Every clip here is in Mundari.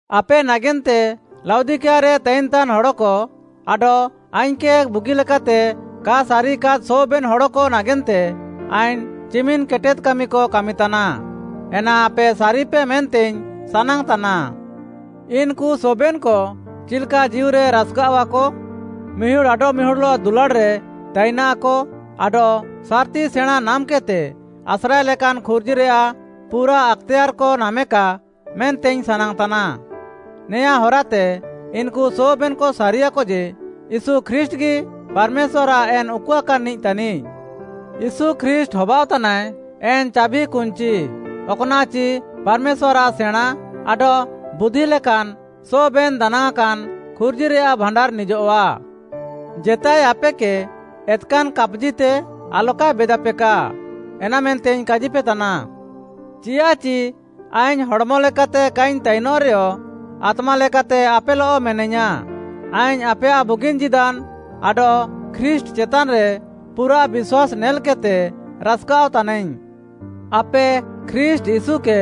ଆପେ ନାଗେନ୍ତେ, ଲାଉଦିକିଆରେ ତାଇନ୍‌ତାନ୍‌ ହଡ଼କ ଆଡଃ ଆଇଙ୍ଗ୍‌କେ ବୁଗିଲେକାତେ କା ସାରିୟାକାଦ୍‌ ସବେନ୍‌ ହଡ଼କ ନାଗେନ୍ତେ ଆଇଙ୍ଗ୍‌ ଚିମିନ୍‌ କେଟେଦ୍‌ କାମିକ କାମିତାନା। ଏନା ଆପେ ସାରିପେ ମେନ୍ତେଇଙ୍ଗ୍‌ ସାନାଙ୍ଗ୍‌ତାନା। ଇନ୍‌କୁ ସବେନ୍‌କ ଚିଲ୍‌କା ଜୀଉରେ ରାସ୍‌କାଅଃଆକ, ମିହୁଡ଼୍‌ ଆଡଃମିହୁଡ଼୍‌ଲଃ ଦୁଲାଡ଼୍‌ରେ ତାଇନାକ ଆଡଃ ସାର୍‌ତି ସେଣାଁ ନାମ୍‌କେଦ୍‌ତେ ଆସ୍ରାଏ ଲେକାନ୍‌ ଖୁର୍ଜିରେୟାଃ ପୁରା ଆକ୍‌ତେୟାର୍‌କ ନାମେକା ମେନ୍ତେଇଙ୍ଗ୍‌ ସାନାଙ୍ଗ୍‌ତାନା। ନେଆଁ ହରାତେ ଇନ୍‌କୁ ସବେନ୍‌କ ସାରିୟାକ ଯେ, ୟୀଶୁ ଖ୍ରୀଷ୍ଟ୍‌ଗି ପାର୍‌ମେଶ୍ୱାର୍‌ଆଃ ଏନ୍‌ ଉକୁଆକାନ୍‌ନିଃ ତାନିଃ। ୟୀଶୁ ଖ୍ରୀଷ୍ଟ୍‌ ହବାଅଃତାନାଏ ଏନ୍‌ ଚାଭିକୁଞ୍ଚି, ଅକ୍‌ନାଃଚି ପାର୍‌ମେଶ୍ୱାର୍‌ଆଃ ସେଣାଁ ଆଡଃ ବୁଦ୍ଧି ଲେକାନ୍‌ ସବେନ୍‌ ଦାନାଙ୍ଗ୍‌ଆଁକାନ୍‌ ଖୁର୍ଜିରେୟାଃ ଭାଣ୍ଡାର୍‌ ନିଜଃଆ। ଜେତାଏ ଆପେକେ ଏତ୍‌କାନ୍‌ କାପ୍‌ଜିତେ ଆଲକାଏ ବେଦାପେକା, ଏନାମେନ୍ତେଇଙ୍ଗ୍‌ କାଜିପେତାନା। ଚିଆଃଚି ଆଇଙ୍ଗ୍‌ ହଡ଼୍‌ମଲେକାତେ କାଇଙ୍ଗ୍‌ ତାଇନଃରେୟ, ଆତ୍ମାଲେକାତେ ଆପେଲଃ ମେନାଇୟାଁ। ଆଇଙ୍ଗ୍‌ ଆପେୟାଃ ବୁଗିନ୍‌ ଜୀଦାନ୍‌ ଆଡଃ ଖ୍ରୀଷ୍ଟ୍‌ ଚେତାନ୍‌ରେ ପୁରାଃ ବିଶ୍ୱାସ୍‌ ନେଲ୍‌କେଦ୍‌ତେ ରାସ୍‌କାଅଃ ତାନାଇଙ୍ଗ୍‌। ଆପେ ଖ୍ରୀଷ୍ଟ୍‌ ୟୀଶୁକେ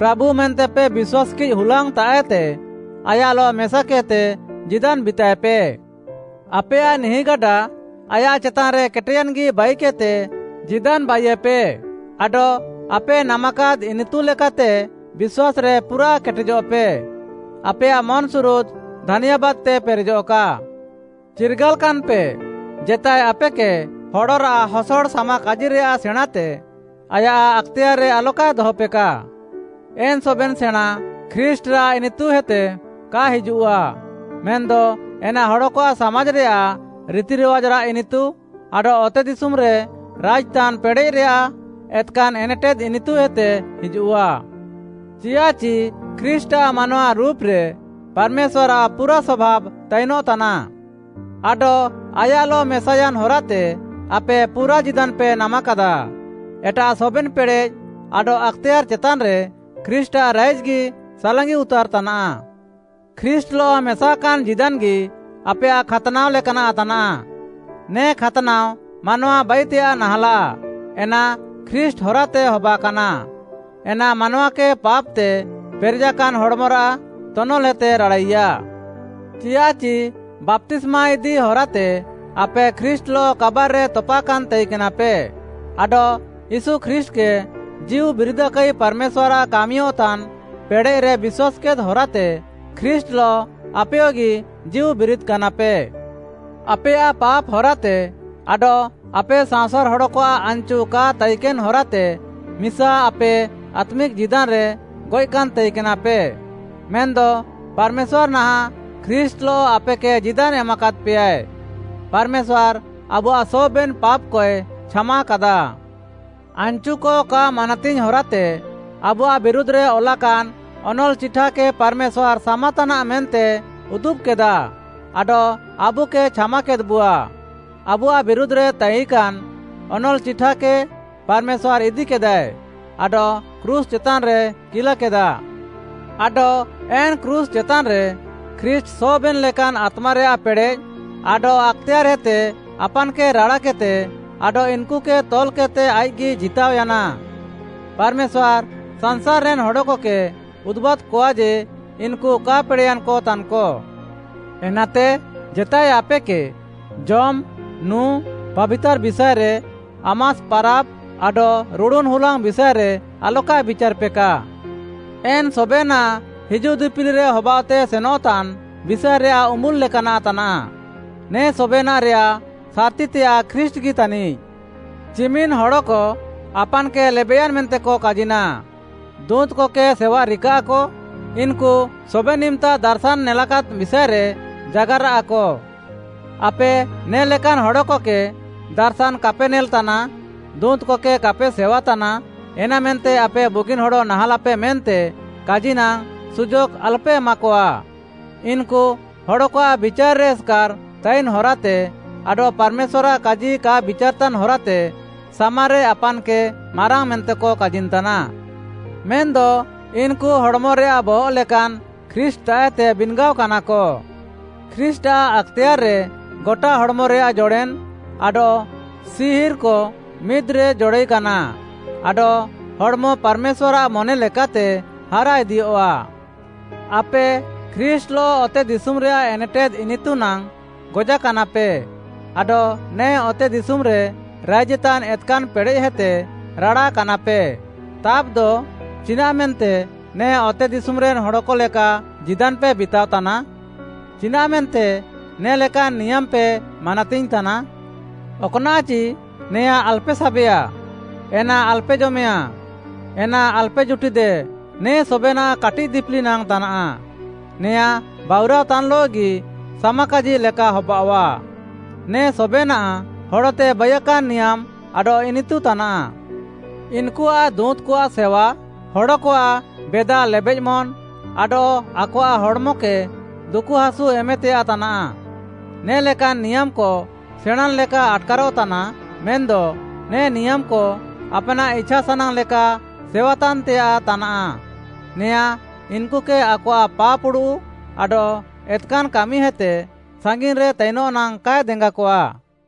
ପ୍ରାଭୁ ମେନ୍ତେପେ ବିଶ୍ୱାସ୍‌କିଃ ହୁଲାଙ୍ଗ୍‌ତାଃଏତେ, ଆୟାଃଲଃ ମେସାକେଦ୍‌ତେ ଜୀଦାନ୍‌ ବିତାଏପେ। ଆପେୟାଃ ନିହିଁଗାଡା ଆୟାଃ ଚେତାନ୍‌ରେ କେଟେୟାନ୍‌ଗି ବାଇକେଦ୍‌ତେ ଜୀଦାନ୍‌ ବାଇୟେପେ ଆଡଃ ଆପେ ନାମାକାଦ୍‌ ଇନିତୁ ଲେକାତେ ବିଶ୍ୱାସ୍‌ରେ ପୁରାଃ କେଟେଜଃପେ। ଆପେୟାଃ ମନ୍‌ସୁରୁଦ୍‌ ଧାନ୍ୟାବାଦ୍‌ତେ ପେରେଜଃକା। ଚିର୍ଗାଲ୍‌କାନ୍‌ପେ, ଜେତାଏ ଆପେକେ ହଡ଼ରାଃ ହସଡ଼ ସାମାକାଜିରେୟାଃ ସେଣାଁତେ, ଆୟାଃ ଆକ୍‌ତେୟାର୍‌ରେ ଆଲକାଏ ଦହପେକା। ଏନ୍‌ ସବେନ୍‌ ସେଣାଁ ଖ୍ରୀଷ୍ଟ୍‌ଆଃ ଇନିତୁହେତେ କା ହିଜୁଃଆ। ମେନ୍‌ଦ ଏନା ହଡ଼କଆଃ ସାମାଜ୍‌ରେୟାଃ ରିତିରିୱାଜ୍‌ରାଃ ଇନିତୁ ଆଡଃ ଅତେଦିଶୁମ୍‌ରେ ରାଇଜ୍‌ତାନ୍‌ ପେଡ଼େଃରେୟାଃ ଏତ୍‌କାନ୍‌ ଏନେଟେଦ୍‌ ଇନିତୁହେତେ ହିଜୁଃଆ। ଚିଆଃଚି ଖ୍ରୀଷ୍ଟ୍‌ଆଃ ମାନୱା ରୁପ୍‌ରେ, ପାର୍‌ମେଶ୍ୱାର୍‌ଆଃ ପୁରା ସଭାବ୍‌ ତାଇନଃତାନା। ଆଡଃ ଆୟାଃଲଃ ମେସାୟାନ୍‌ ହରାତେ ଆପେ ପୁରା ଜୀଦାନ୍‌ପେ ନାମାକାଦା। ଏଟାଃ ସବେନ୍‌ ପେଡ଼େଃ ଆଡଃ ଆକ୍‌ତେୟାର୍‌ ଚେତାନ୍‌ରେ ଖ୍ରୀଷ୍ଟ୍‌ଆଃ ରାଇଜ୍‌ଗି ସାଲାଙ୍ଗି ଉତାର୍‌ ତାନାଃ। ଖ୍ରୀଷ୍ଟ୍‌ଲଃ ମେସାକାନ୍‌ ଜୀଦାନ୍‌ଗି ଆପେୟାଃ ଖାତ୍‌ନାଅ ଲେକାନାଃ ତାନାଃ। ନେ ଖାତ୍‌ନାଅ ମାନୱା ବାଇତେୟାଃ ନାହାଁଲାଃ, ଏନା ଖ୍ରୀଷ୍ଟ୍‌ ହରାତେ ହବାକାନା। ଏନା ମାନୱାକେ ପାପ୍‌ତେ ପେରେଜାକାନ୍‌ ହଡ଼୍‌ମରାଃ ତନଲ୍‌ହେତେ ରାଡ଼ାଇୟା। ଚିଆଃଚି ବାପ୍ତିସ୍ମା ଇଦି ହରାତେ ଆପେ ଖ୍ରୀଷ୍ଟ୍‌ଲଃ କାବାର୍‌ରେ ତପାକାନ୍‌ ତାଇକେନାପେ ଆଡଃ ୟୀଶୁ ଖ୍ରୀଷ୍ଟ୍‌କେ ଜୀଉବିରିଦାକାଇ ପାର୍‌ମେଶ୍ୱାର୍‌ଆଃ କାମିୟଃତାନ୍‌ ପେଡ଼େଃରେ ବିଶ୍ୱାସ୍‌କେଦ୍‌ ହରାତେ ଖ୍ରୀଷ୍ଟ୍‌ଲଃ ଆପେୟଗି ଜୀଉ ବିରିଦ୍‌କାନାପେ। ଆପେୟାଃ ପାପ୍‌ ହରାତେ ଆଡଃ ଆପେ ସାଅଁସାର୍‌ ହଡ଼କଆଃ ଆନ୍‌ଚୁ କା ତାଇକେନ୍‌ ହରାତେ ମିସା ଆପେ ଆତ୍ମିକ୍‌ ଜୀଦାନ୍‌ରେ ଗଏଃକାନ୍‌ ତାଇକେନାପେ, ମେନ୍‌ଦ ପାର୍‌ମେଶ୍ୱାର୍‌ ନାହାଁଃ ଖ୍ରୀଷ୍ଟ୍‌ଲଃ ଆପେକେ ଜୀଦାନ୍‌ ଏମାକାଦ୍‌ପେୟାଏ। ପାର୍‌ମେଶ୍ୱାର୍‌ ଆବୁଆଃ ସବେନ୍‌ ପାପ୍‌କଏ ଛାମାକାଦା। ଆନ୍‌ଚୁକ କା ମାନାତିଙ୍ଗ୍‌ ହରାତେ ଆବୁଆଃ ବିରୁଧ୍‌ରେ ଅଲାକାନ୍‌ ଅନଲ୍‌ଚିଠାକେ ପାର୍‌ମେଶ୍ୱାର୍‌ ସାମାତାନାଃ ମେନ୍ତେ ଉଦୁବ୍‌କେଦା, ଆଡଃ ଆବୁକେ ଛାମାକେଦ୍‌ବୁଆ। ଆବୁଆଃ ବିରୁଧ୍‌ରେ ତାଇକାନ୍‌ ଅନଲ୍‌ଚିଠାକେ ପାର୍‌ମେଶ୍ୱାର୍‌ ଇଦିକେଦାଏ ଆଡଃ କ୍ରୁଶ୍‌ ଚେତାନ୍‌ରେ କିଲାକେଦା। ଆଡଃ ଏନ୍‌ କ୍ରୁଶ୍‌ ଚେତାନ୍‌ରେ ଖ୍ରୀଷ୍ଟ୍‌ ସବେନ୍‌ ଲେକାନ୍‌ ଆତ୍ମାରେୟାଃ ପେଡ଼େଃ ଆଡଃ ଆକ୍‌ତେୟାର୍‌ହେତେ ଆପାନ୍‌କେ ରାଡ଼ାକେଦ୍‌ତେ ଆଡଃ ଇନ୍‌କୁକେ ତଲ୍‌କେଦ୍‌ତେ ଆଇଃକ୍‌ଗି ଜିତାଅୟାନା। ପାର୍‌ମେଶ୍ୱାର୍‌ ସାଂସାର୍‌ରେନ୍‌ ହଡ଼କକେ ଉଦୁବାଦ୍‌କଆ ଯେ, ଇନ୍‌କୁ କା ପେଡ଼େୟାନ୍‌କ ତାନ୍‌କ। ଏନାତେ ଜେତାଏ ଆପେକେ ଜମ୍‌, ନୁଁ, ପାବିତାର୍‌ ବିଷାଏରେ, ଆମାସ୍‌ ପାରାବ୍‌, ଆଡଃ ରୁଡ଼ୁନ୍‌ ହୁଲାଙ୍ଗ୍‌ ବିଷାଏରେ ଆଲକାଏ ବିଚାର୍‌ପେକା। ଏନ୍‌ ସବେନାଃ ହିଜୁଃ ଦିପିଲିରେ ହବାଅଃତେ ସେନଃତାନ୍‌ ବିଷାଏରେୟାଃ ଉମ୍ବୁଲ୍‌ ଲେକାନାଃ ତାନାଃ। ନେ ସବେନାଃରେୟାଃ ସାର୍‌ତିତେୟାଃ ଖ୍ରୀଷ୍ଟ୍‌ଗି ତାନିଃ। ଚିମିନ୍‌ ହଡ଼କ ଆପାନ୍‌କେ ଲେବେଃୟାନ୍‌ ମେନ୍ତେକ କାଜିନା, ଦୁଁତ୍‌କକେ ସେୱା ରିକାଃକ, ଇନ୍‌କୁ ସବେନ୍‌ ଇମ୍‌ତା ଦାର୍‌ଶାନ୍‌ ନେଲାକାଦ୍‌ ବିଷାଏରେ ଜାଗାରାଃକ। ଆପେ ନେ'ଲେକାନ୍‌ ହଡ଼କକେ, ଦାର୍‌ଶାନ୍‌ କାପେ ନେଲ୍‌ତାନା, ଦୁଁତ୍‌କକେ କାପେ ସେୱାତାନା, ଏନାମେନ୍ତେ ଆପେ ବୁଗିନ୍‌ ହଡ଼ ନାହାଁଲାପେ ମେନ୍ତେ କାଜିନାଙ୍ଗ୍‌, ସୁଯୋଗ୍‌ ଆଲପେ ଏମାକଆ। ଇନ୍‌କୁ ହଡ଼କଆଃ ବିଚାର୍‌ରେ ଏସ୍‌କାର୍‌ ତାଇନ୍‌ ହରାତେ ଆଡଃ ପାର୍‌ମେଶ୍ୱାର୍‌ଆଃ କାଜି କା ବିଚାର୍‌ତାନ୍‌ ହରାତେ ସାମାରେ ଆପାନ୍‌କେ ମାରାଙ୍ଗ୍‌ ମେନ୍ତେକ କାଜିନ୍‌ତାନା। ମେନ୍‌ଦ ଇନ୍‌କୁ ହଡ଼୍‌ମରେୟାଃ ବହଃ ଲେକାନ୍‌ ଖ୍ରୀଷ୍ଟ୍‌ତାଃଏତେ ବିନ୍‌ଗାଅକାନାକ। ଖ୍ରୀଷ୍ଟ୍‌ଆଃ ଆକ୍‌ତେୟାର୍‌ରେ ଗଟା ହଡ଼୍‌ମରେୟାଃ ଜଡ଼େନ୍‌ ଆଡଃ ସିହିର୍‌କ ମିଦ୍‌ରେ ଜଡ଼ାଇକାନା ଆଡଃ ହଡ଼୍‌ମ ପାର୍‌ମେଶ୍ୱାର୍‌ଆଃ ମନେ ଲେକାତେ ହାରାଇଦିୟଃଆ। ଆପେ ଖ୍ରୀଷ୍ଟ୍‌ଲଃ ଅତେଦିଶୁମ୍‌ରେୟାଃ ଏନେଟେଦ୍‌ ଇନିତୁ ନାଙ୍ଗ୍‌ ଗଜାକାନାପେ ଆଡଃ ନେ ଅତେଦିଶୁମ୍‌ରେ ରାଇଜେତାନ୍‌ ଏତ୍‌କାନ୍‌ ପେଡ଼େଃହେତେ ରାଡ଼ାକାନାପେ। ତାବ୍‌ଦ ଚିନାଃମେନ୍ତେ ନେ ଅତେଦିଶୁମ୍‌ରେନ୍‌ ହଡ଼କ ଲେକା ଜୀଦାନ୍‌ପେ ବିତାଅତାନା? ଚିନାଃମେନ୍ତେ ନେ ଲେକାନ୍‌ ନିୟାମ୍‌ପେ ମାନାତିଙ୍ଗ୍‌ ତାନା? ଅକ୍‌ନାଃଚି, “ନେଆଁ ଆଲପେ ସାବେଆ, ଏନା ଆଲପେ ଜମେୟାଁ, ଏନା ଆଲପେ ଜୁଟିଦେ,” ନେ ସବେନାଃ କାଟିଃ ଦିପିଲି ନାଙ୍ଗ୍‌ ତାନାଃ। ନେଆଁ ବାଉରାଅତାନ୍‌ଲଃଗି ସାମାକାଜି ଲେକା ହବାଅଃଆ। ନେ ସବେନାଃ ହଡ଼ତେ ବାଇୟାକାନ୍‌ ନିୟାମ୍‌ ଆଡଃ ଇନିତୁ ତାନାଃ। ଇନ୍‌କୁଆଃ ଦୁଁତ୍‌କଆଃ ସେୱା, ହଡ଼କଆଃ ବେଦା ଲେବେଃମନ୍‌ ଆଡଃ ଆକଆଃ ହଡ଼୍‌ମକେ ଦୁକୁହାସୁ ଏମେତେୟାଃ ତାନାଃ। ନେ'ଲେକାନ୍‌ ନିୟାମ୍‌କ ସେଣାଁନ୍‌ ଲେକା ଆଟ୍‌କାରଃ ତାନା, ମେନ୍‌ଦ ନେ ନିୟାମ୍‌କ ଆପ୍‌ନାଃ ଇଛାସାନାଙ୍ଗ୍‌ ଲେକା ସେୱାତାନ୍‌ତେୟାଃ ତାନାଃ। ନେଆଁ ଇନ୍‌କୁକେ ଆକଆଃ ପାପ୍‌ ଉଡ଼ୁଃ ଆଡଃ ଏତ୍‌କାନ୍‌ କାମିହେତେ ସାଙ୍ଗିନ୍‌ରେ ତାଇନଃ ନାଙ୍ଗ୍‌ କାଏ ଦେଙ୍ଗାକଆଃ।